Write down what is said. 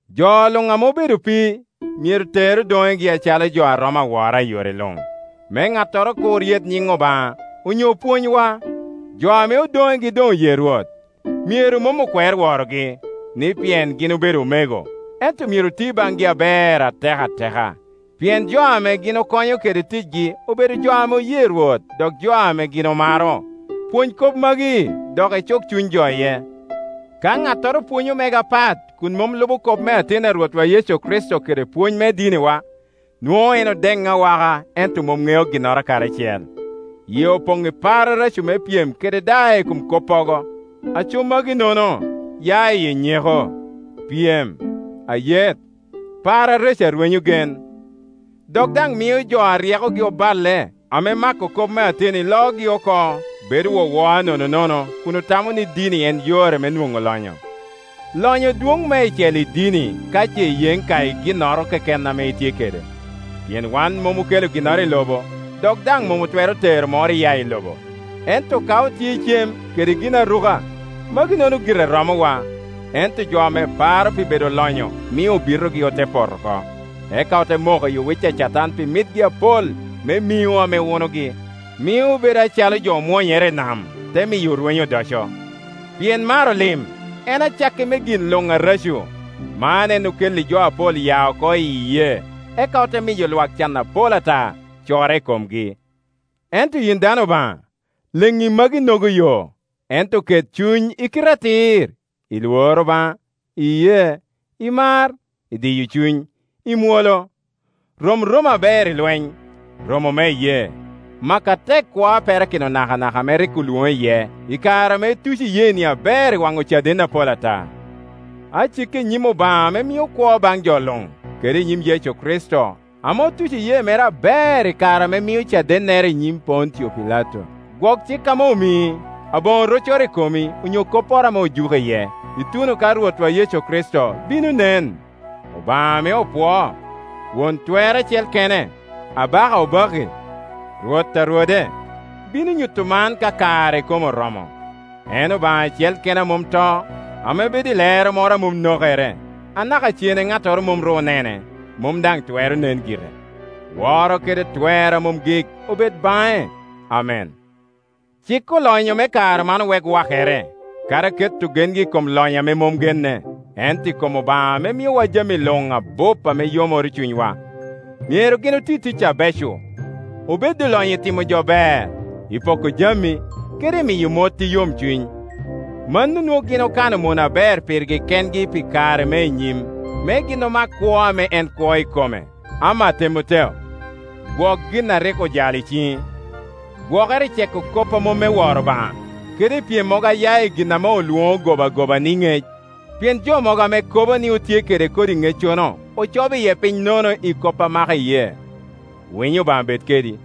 Jo luŋ ame obedo opii, myero ter odonegi acalo jo a romo awora i yore luŋ, me ŋattoro kur yet nyiŋ Obaŋa onyo pwonywa. Jo ame odonegi doŋ oye Rwot, myero mom okwer worogi, ni pien gin obedo omego, ento myero oti baŋgi aber atek ateka, pien jo ame gin okonyo kede ticgi obedo jo ame oye Rwot dok jo ame gin omaro. Lworo Obaŋa kede yeŋ i jami Pwony kop magi dok icuk cuny jo iye. Ka ŋattoro pwonyo mege apat kun mom lubo kop ateni a Rwotwa Yecu Kricito kede pwony me diniwa, nwoŋo en odeŋ awaka ento mom ŋeo ginnoro kadi acel. Yie Opoŋ i par areco me pyem kede daa i kom koppogo; aco magi-nono ya iye nyeko, pyem, ayet, par areco a rwenyo gen. Dok daŋ mio jo a ryekogi oballe, ame mako kop me ateni loogi oko, bedo wowoa nononono, kun otamo ni dini en yore me nwoŋo lonyo. Lonyo dwoŋ meicel i dini ka ce iyeŋ ka i ginnoro keken ame itye kede. Pien wan mom okelo ginnoro i lobo, dok daŋ mom otwero tero moro iya i lobo. Ento ka otye i cem kede ginaruka, magi-nono gire romowa. Ento jo ame paro pi bedo olonyo mio obitogi ote poto oko, eka ote moko i owic a Catan pi mitgi apol me miŋo ame wunogi, mio obedo acalo jo omwonyere i nam, te miyo orwenyo odoco. Pien maro lim, en acakki me gin luŋ areco; man en okelli jo apol ya oko iyi iyee, eka ote miyo lwak can apol ata corre i komgi. Ento yin dano Obaŋa, leŋŋi maginogo yo, ento ket cuny i kite atir, i lworo Obaŋa, i iyee, i mar, i diyo cuny, i mwolo. Rom romo aber i Iweny, romo me iyee, mak atek kwo a perakino nakanaka, ame rik olwoŋi iye i kare ame ituco iyeeni aber i wan ocaden apol ata. Aciki i nyim Obaŋa ame mio kwo baŋ jo luŋ, kede i nyim Yecu Kricito, ame otuco iyee mere aber i kare ame mio cadennere i nyim Pontio Pilato, gwok cik ame omii, aboŋo roccoro i komi onyo kopporo ame ojuki iye, ituno ka Rwotwa Yecu Kricito bino nen. Obaŋa ame opwoo, Won Twer acel kene, Abaka obakki, Rwot a rwode, bino nyuto man ka kare ikome oromo. En Obaŋa acel kene a mom to, ame bedo i lero moro a mom nokere, anaka cene ŋattoro mom ru onene, mom daŋ twero nen gire. Woro kede twer a mom gik obed baŋe. Amen. Cik olonyo me kare man owek wakere, kadi keto gengi i kom lonyo ame mom genne, ento i kom Obaŋa ame miowa jami luŋ abup me yomoro cunywa. Myero gin oti tic abeco, obed olonyo i timo jo ber, i poko jami, kede i miyo mot i yomcuny. Mano nwoŋo gin okano mono aber pirgi kengi pi kare me i nyim, me gin mak kwo ame en kwo ikome. Ama Temoteo, gwok gin a rik ojalo i ciŋi. Gwokere i ceko kop a mom me woro Obaŋa, kede i pyemmogo a ya i gin ame olwono gobagoba ni “ŋec”: pien jo mogo ame kobo ni otye kede kodi ŋeccono ocobo iye piny nono i kop a mako iyee. Winyo Obaŋa bed kedi.